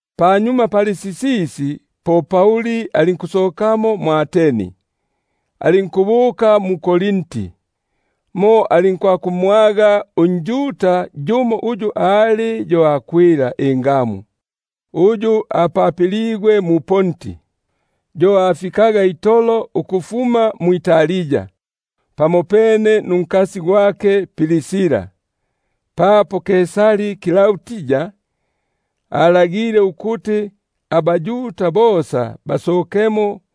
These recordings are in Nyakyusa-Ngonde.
Panyuma pali sisisi, po Pauli alinkusokamo mwʼAteni, alinkubuka mu-Korinti. Mo alinkumwaga unjuda yumo uyu ali yo Akwila ingamu, uyu apapiligwe mu-Ponti; yo afikaga itolo ukufuma mwʼItali pamopone nunkasi gwake Prisila, papo Klaudi alagile ukuti abaYuda bosa basokemo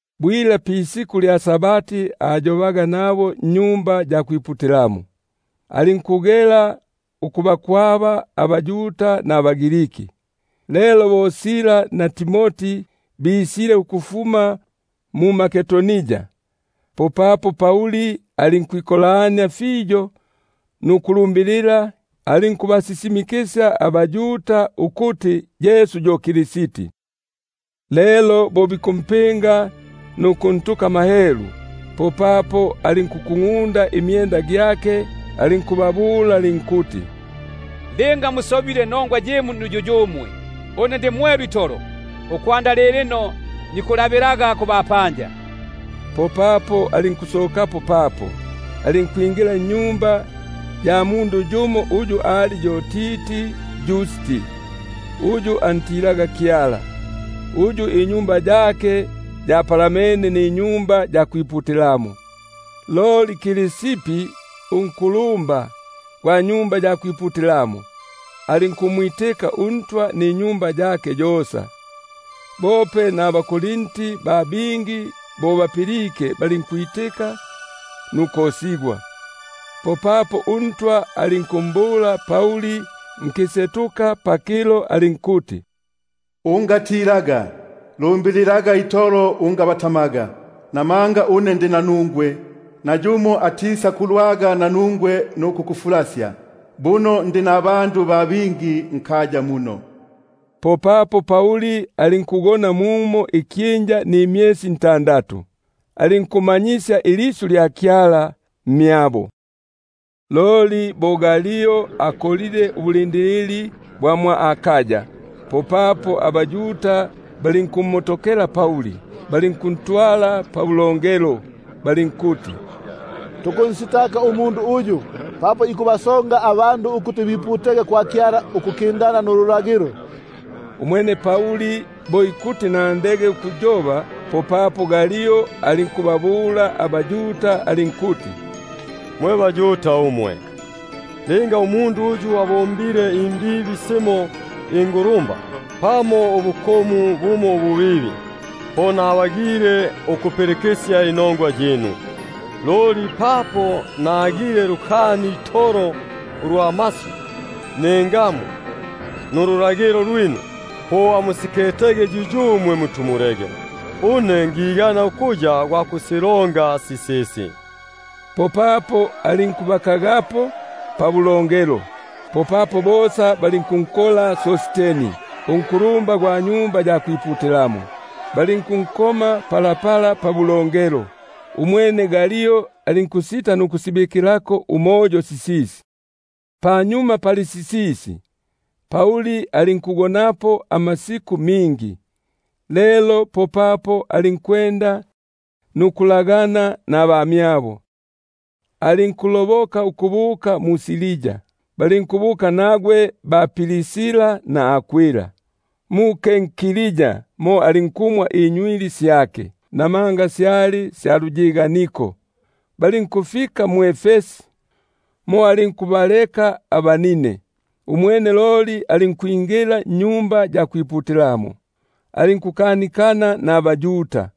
Bwila pa-Sabati alinkukanikana nabo mu-Sinagogi, alinkugela ukubatobesya abaYuda nabaGriki. Lelo bo Sila na Timoti basulwike ukufuma mMakedonia, popapo Pauli alinkwikolania fiyo nukulumbilila; alinkubasisi- mikisya abaYuda ukuti Yesu yo yu Kristi. Lelo bo bikupinga nukunhelula, popapo alinkukungʼunda imyenda gyake alinkubabula alinkuti: Ililopa lyinu liyege pamitu gyinu, une ndi mwelu itolo, ukwanda lilino nikulabilaga kubapanja. Popapo alinkusokapo papo, alinkwingila nnyumba ya mundu yumo uyu ali yo Titi Yusti, uyu antilaga Kyala, uyu inyumba yake yapalamene niSinagogi. Loli Krispi, unkulumba gwa Sinagogi, alinkumwitika uNtwa ninyumba yake yosa; bope naba- Korinti ba bingi bo bapilike, balinkwitika nukosigwa. Popapo uNtwa alinkumbula Pauli nkisetuka pakilo alinkuti: Unga- tilaga, loli yobaga itolo ungabatamaga; namanga une ndi nanungwe, nayumo atisakulwaga nanungwe nukukufulasya, buno ndi nabo abandu ba bingi nkaya muno. Umwene alinkugona mumo ikyinja kimo nimyesi ntandatu, alinkumanyisya ilisyu lya Kyala mmyabo. Umwene Galio bo akolile ubulindilili bwa mwʼAkaya, popapo abaYuda balinkumotokela Pauli, balinkuntwala pabu- longelo, balinkuti: Umundu uyu ikubasonga abandu ukuti biputege kwa Kyala ukukindana nululagilo. Umwene Pauli bo ikuti ninule imilomo gyake, popapo Galio alinkubabula abaYuda alinkuti: Mwe baYuda umwe, linga umundu uyu abombile imbibi simo ingulumba, pamo ubukomu bumo ububibi, po nabagile ukupilikisya inongwa yinu. Loli papo nagile lukani itolo ulwa masyu, ningamu, nululagilo lwinu, po amusiketege yuyumwe; une ngigana ukuya gwa kusilonga sisisi. Popapo alinkubakagapo pabulongelo. Popapo bosa balinkunkola Sosteni, unkulumba gwa Sinagogi, balinkunkomela pa pabulongelo, umwene Galio alinkusita nukusibikilako umoyo sisisi. Panyuma pali sisisi, Pauli alinkugonapo amasiku mingi, lelo popapo alinkulagana nabamyabo. Alinkuloboka ukubuka mu-Siria, balinkubuka nagwe ba-Prisila na Akwila. Mu-Kenkrea mo alinkumwa inywili syake, namanga syali sya luyiganiko. Balinkufika mwʼEfesi, mo alinkubaleka abanine; umwene loli alinkwingila mu-Sinagogi, alinkukanikana naba- Yuda.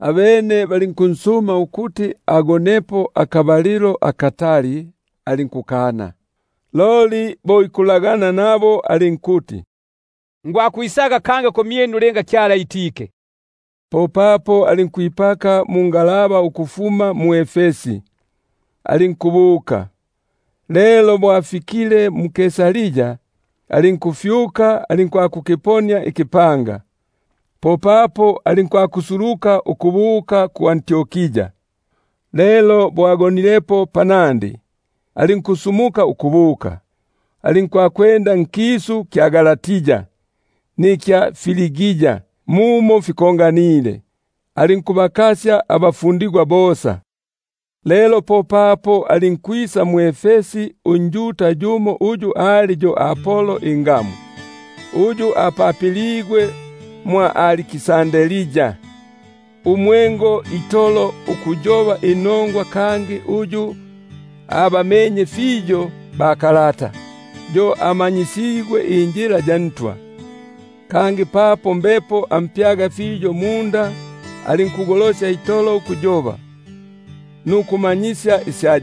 Abene bo bansumile ukuti agonepo akabalilo akatali, alinkukana; loli bo ikulagana nabo alinkuti: Ngwakwisaga kangi kumyinu linga Kyala itike. Popapo alinkwipaka mungalaba ukufuma mwʼEfesi, alinkubuka. Lelo bo afikile mu-Kaisaria, alinkufyuka, alinkwakukiponia ikipanga; popapo alinkusuluka ukubuka mwʼAntiokia. Lelo bo agonilepo, alinkusumuka ukubuka, alinkwakupulungania nkisu kya Galati na Frigia muno fikonganile, alinkubakasya abafundigwa bosa. Lelo popapo alinkwisa mwʼEfesi unjuda yumo uyu ali yo Apolo, uyu apapiligwe mwʼAliksandria, umwengo itolo ukuyoba inongwa, kangi uyu abamenye fiyo bakalata. Yo amanyisigwe injila ya Ntwa; kangi papo mbepo ampyaga fiyo munda, alinkugolosya itolo ukuyoba nukumanyisya isya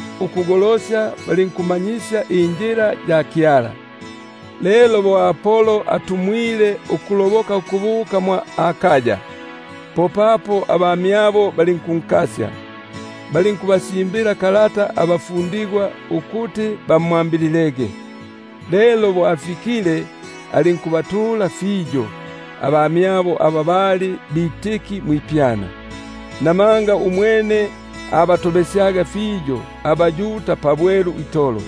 ukugolosya ukundingania injila ya Kyala. Lelo bo ikulonda ukuloboka ukubuka mwʼAkaya, popapo abamyabo balinkunkasya, balinkubasimbila kalata abafundigwa ukuti bamwambililege. Lelo bo afikile, alinkubatula fiyo aba balipelile ukuya bitiki mu mwipyana. Namanga umwene abatobesyaga fiyo abaYuda pabwelu itolo,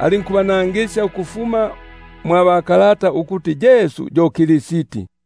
alinkubanangisya ukufuma mwa bakalata ukuti Yesu yo Kristi.